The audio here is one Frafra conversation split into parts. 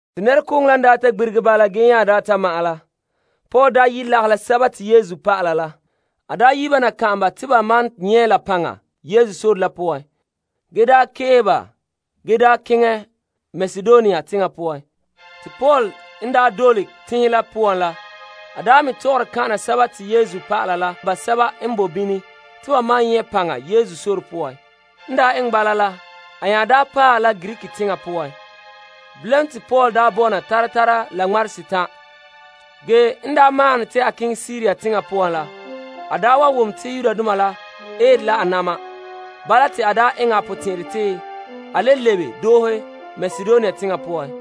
Te nɛrekooŋɔ la n daa ta gbirige bala ge nya ta ma'ɛn la, Paul yi' lagahɛ la Yesu dɔlɔba la kan'an ba te ba maan nyɛ' la paŋa Yesu dɔlɔga la poan ge keehe ba ge keŋɛ Makedonia teŋa poan. Paul n keŋɛ dɔla teŋhe la poan la, a me tɔgɔre kan'ana Yesu nɛreba la basɛba n bo bini te ba maan nyɛ' paŋa Yesu dɔlɔga poan. En daa eŋɛ bala a nya paɛ la Greek teŋa poan. Bilam te Paul bɔna tara tara la ŋmarehe setan'. En maahom ne te a keŋɛ Siria teŋa poan la, a wa wom to Yudoma la eere la a na'ma. Bala te a eŋɛ a potɛn'ɛrɛ te a le lebe doohe Makedonia teŋa poan.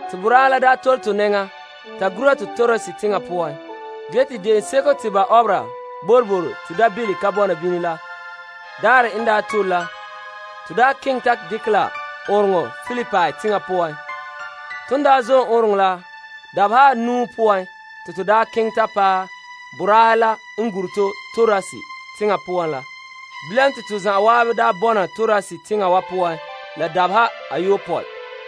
Te boraahe la tole to nɛŋa ta gura to Troas teŋa poan. Ge te Boroboro N Ka Tare Mi'ihom De'eŋɔ daarɛ n tole la, to keŋɛ ta dekɛ ɔɔnrɔŋɔ kantɛ Filipi teŋa poan. Ton zom ɔɔnrɔŋɔ kantɛ la dabeha anuu poan te to keŋɛ ta paɛ boraahe la n gure to Troas teŋa poan la mɛ. Bilam te to zan'an bɔna Troas teŋa wa poan la dabeha ayopɔe.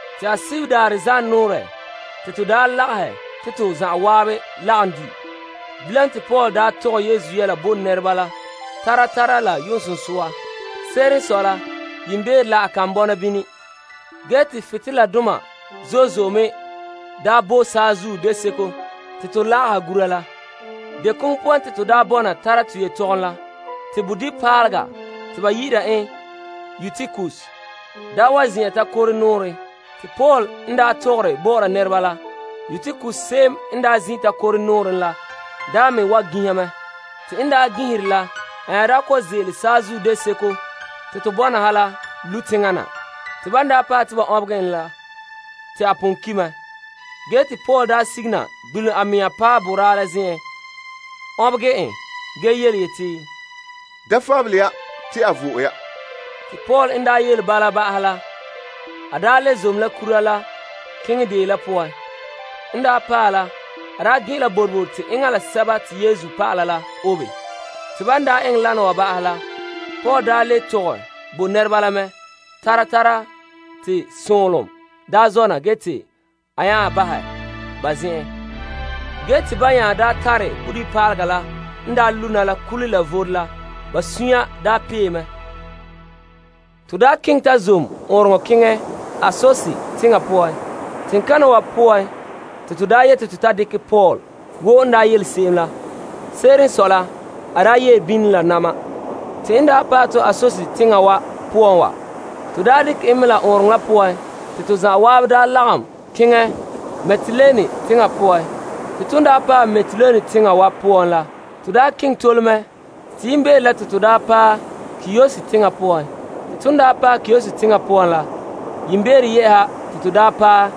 Te Alaherɛ daarɛ zanɔɔrɛ ton lagahɛ te to zan'an lagom di', bilam te Paul tɔgɛ Yesu yɛla bo nɛreba la tara tara la yu'uŋsunsua. Se'ere n sɔe la yiimbeere la a kan bɔna bini. Ge te butoleladoma zo'e zo'e me bo saazuo deseko te to lagaha gura paara la. Te bodibipaalega te ba yi'ira en Eutikus zin'an takore nɔɔrɛ. Te Paul n tɔgɔre bɔ'ɔra nɛreba la, Eutikus la me wa ginha. Te en ginhera la, a nya kɔ'ɔn ze'ele saazuo deseko te to bɔna ha la, lu' teŋa na. Te ban paɛ te ba ɔnbegɛ en la, te a pon ki' mɛ. Ge te Paul sige na gbelom a mea paɛ boraa la zen'en ɔnbegɛ en ge yeti, Da fabele ya te a vo'e ya. Te Paul nya le zom la kura la keŋɛ deo la poan. En paɛ la a gen'ɛn la boroboro te enŋa la Yesu dɔlɔba la obe. Te Paul le tɔgɛ bo nɛreba la mɛ tara tara te sonlom ta zona ge te a nya bahɛ ba zen'en. Ba nya tare bodibipaalega n lu' na la kule la vore la, te ba sunya pee mɛ zo'e zo'e. Tomam keŋɛ ta zom ɔɔnrɔŋɔ kantɛ keŋɛ Assos teŋa poan, teŋkana wa poan te to yete to ta dekɛ Paul wo n yele to se'em la. Ge Paul ye' bini la na'ma. Ton daa paɛ to Assos teŋa wa poan wa, to dekɛ Paul mɛ ɔɔnrɔŋɔ kantɛ la poan te to zan'an lagom keŋɛ Mitilene teŋa poan. Ton paɛ Mitilene teŋa wa poan la, to keŋɛ tole mɛ te yiimbeere la te to paɛ Kios teŋa poan. Yiimbeere yɛ'ɛha te to paɛ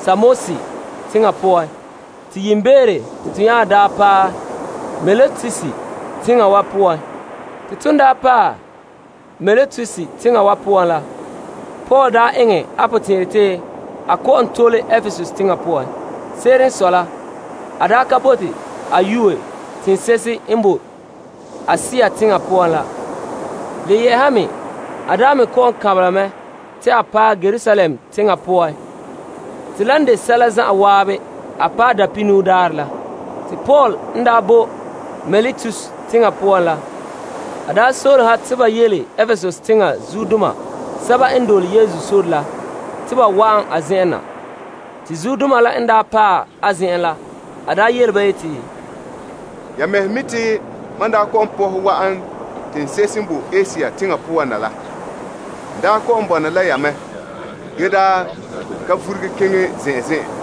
Samos teŋa poan te yiimbeere te to nya paɛ Miletus teŋa wa poan. Ton paɛ Miletus teŋa wa poan la, Paul eŋɛ a potɛn'ɛrɛ te a kɔ'ɔn tole Epesus teŋa poan. A ka bote a yue teŋse'ehe n bo Asia teŋa poan la. Se'ere n sɔe a me kɔ'ɔn kanbela mɛ te a paɛ Yerusalem teŋa poan te la n de sɛla zan'an a paɛ Dapihinuu Daarɛ la. Paul n bo Miletus teŋa poan la, a soolom ha te ba yele Epesusdoma n dole Yesu zuodoma la te ba wa'an a zen'en na. Te zuodoma la n paɛ a zen'en la, a yele ba yeti, Ya mɛhe mi' te mam daa kɔ'ɔn pɔhɛ wa'an teŋse'ehe n bo Asia teŋa poan la, n kɔ'ɔn bɔna la ya mɛ ge ka vuruge keŋɛ zen'an zen'an.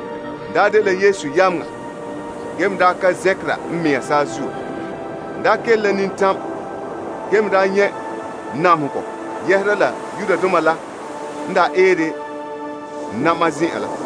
N daa dela Yesu yameŋa sigihe n mea la kele la nintam ge me nyɛ' namehegɔ zo'e zo'e yɛhera la Yudoma la n eere n na'ma zen'an la.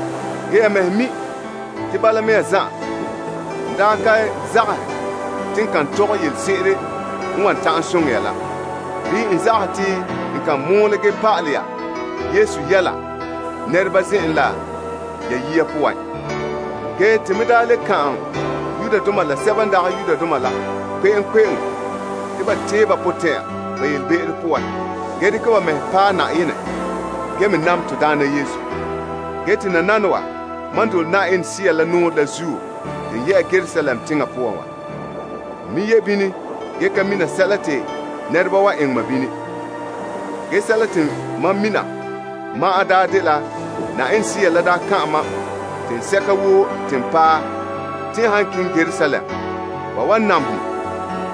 Ge ya mɛhe mi' te bala mea zan'an n daa ka zagahɛ te n kan tɔgɛ yelese'ere n wan ta'an soŋɛ ya la bii n kan mɔɔlɛ pa'alɛ ya Yesu yɛla nɛreba zen'en la ya yiya poan, kan'an Yudoma la sɛba n dagɛ Yudoma la kpe'eŋkpe'eŋo te ba tee ba potɛn'ya ba be'em poan ge dekɛ ba mɛhe paɛ Yenɛ ge me nam to Daana Yesu. Te nananawa mam dole Yenɛ Sea la nɔɔrɛ la zuo te n ye'a Yerusalem teŋa poan wa ge ka mina sɛla te nɛreba wan eŋɛ mam bini. Ge sɛla te mam mina ma'an dela Yenɛ Sea n daa kan'an ma teŋsɛka woo te n han paɛ Yerusalem, ba wan namehɛ ma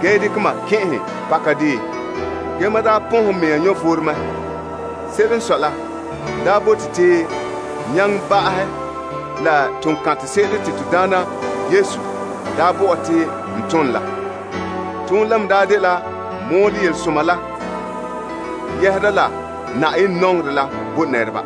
zo'e zo'e ge dekɛ ma kɛn'ɛhɛ pakadeen. Ge mam pɔnhɛ n mea vom mɛ. Se'ere n sɔe la n bote te n nyaŋɛ ba'ahɛ la toonkantɛ se'ere te to Daana Yesu bo ɔ te n ton la. Toonɛ la me dela n mɔɔlɛ yelesoma yɛhera la Yenɛ nɔŋerɛ la bo nɛreba.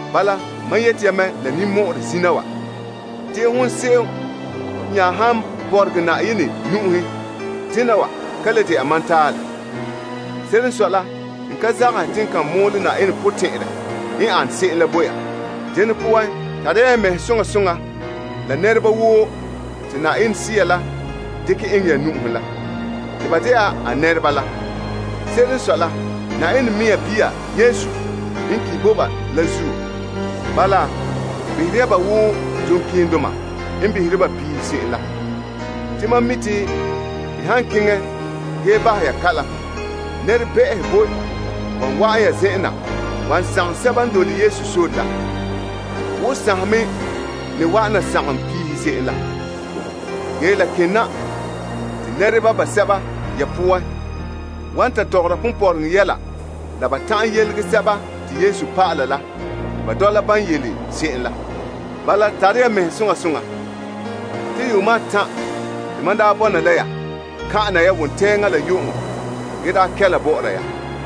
Bala mam yete ya mɛ la ninmɔ'ɔrɛ zina wa te hon se'em nya han bɔregɛ Yenɛ nu'uhen dena wa ka le de'a mam talɛ. Se'ere n sɔe la n ka zagahɛ te n kan mɔɔlɛ Yenɛ potɛn'ɛrɛ n ane se'em la bo ya. Dene poan tare ya ya mɛhe soŋa soŋa la nɛresɛba woo te Yenɛ Sea la dekɛ eŋɛ ya nu'uhen la, te ba de'a a nɛreba. Se'ere n sɔe la Yenɛ mea bia Yesu n ki' bo ba la zuo. Bala, behera ya ba wo duŋkeendoma n behere ba piihe se'em la. Te mam mi' te n han keŋɛ ge bahɛ ya kalam, nɛrebɛ'ɛhe boe wan wa'an ya zen'en na wan sagom sɛba n dole Yesu sore la, wo sanhe me ne wa'an na sagom piihe se'em la. Ge la kena te nɛreba basɛba ya poan wan ta tɔgɔra ponpɔrɔŋɔ yɛla la ba ta'an yelege Yesu dɔlɔba la te ba dɔla ban yele se'em la. Bala, tare ya zuto soŋa soŋa ge tɛnra te yuuma atan' te mam daa bɔna la ya kan'ana ya wontɛŋa la yu'uŋɔ kɛla bɔ'ɔra ya.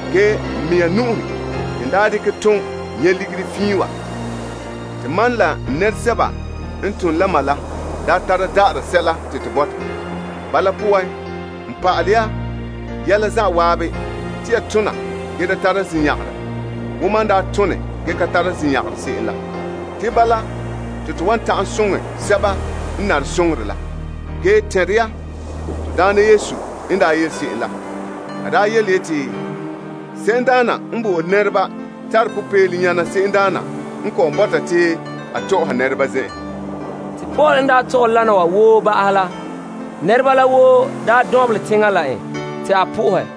Ge n mea nu'uhen te n daa dekɛ tom nyɛ' ligiri fiin wa, te mam la n nɛresɛba n tom la ma la daa tara da'ara sɛla te to bɔta. Bala poan n pa'alɛ ya yɛla zan'an te ya tona ge da tara zinyagarɛ wo mam daa tone ge ka tara zinyagarɛ se'em la. Te bala te to wan ta'an soŋɛ sɛba n nare soŋorɛ la. Ge tɛn'ɛre ya to Daana Yesu n yele se'em la. A yeti, Se'emdaana n bo'ore nɛreba tare popeelom zo'e zo'e nyana se'emdaana n kɔ'ɔn bɔta te a tɔ'ɔha nɛreba zen'en. Paul n tɔgɛ lana wa woo ba'ahɛ la, nɛreba la woo dɔnbelɛ teŋa la en te a soha Na'ayenɛ.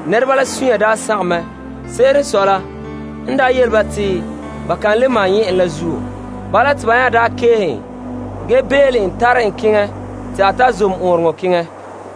te ba la sunya sagom mɛ zo'e zo'e. Se'ere n sɔe la n yele ba te ba ka le maan nyɛ' en la zuo. Bala te ba nya keehe en ge bele en tare en keŋɛ te a ta zom ɔɔnrɔŋɔ kantɛ keŋɛ.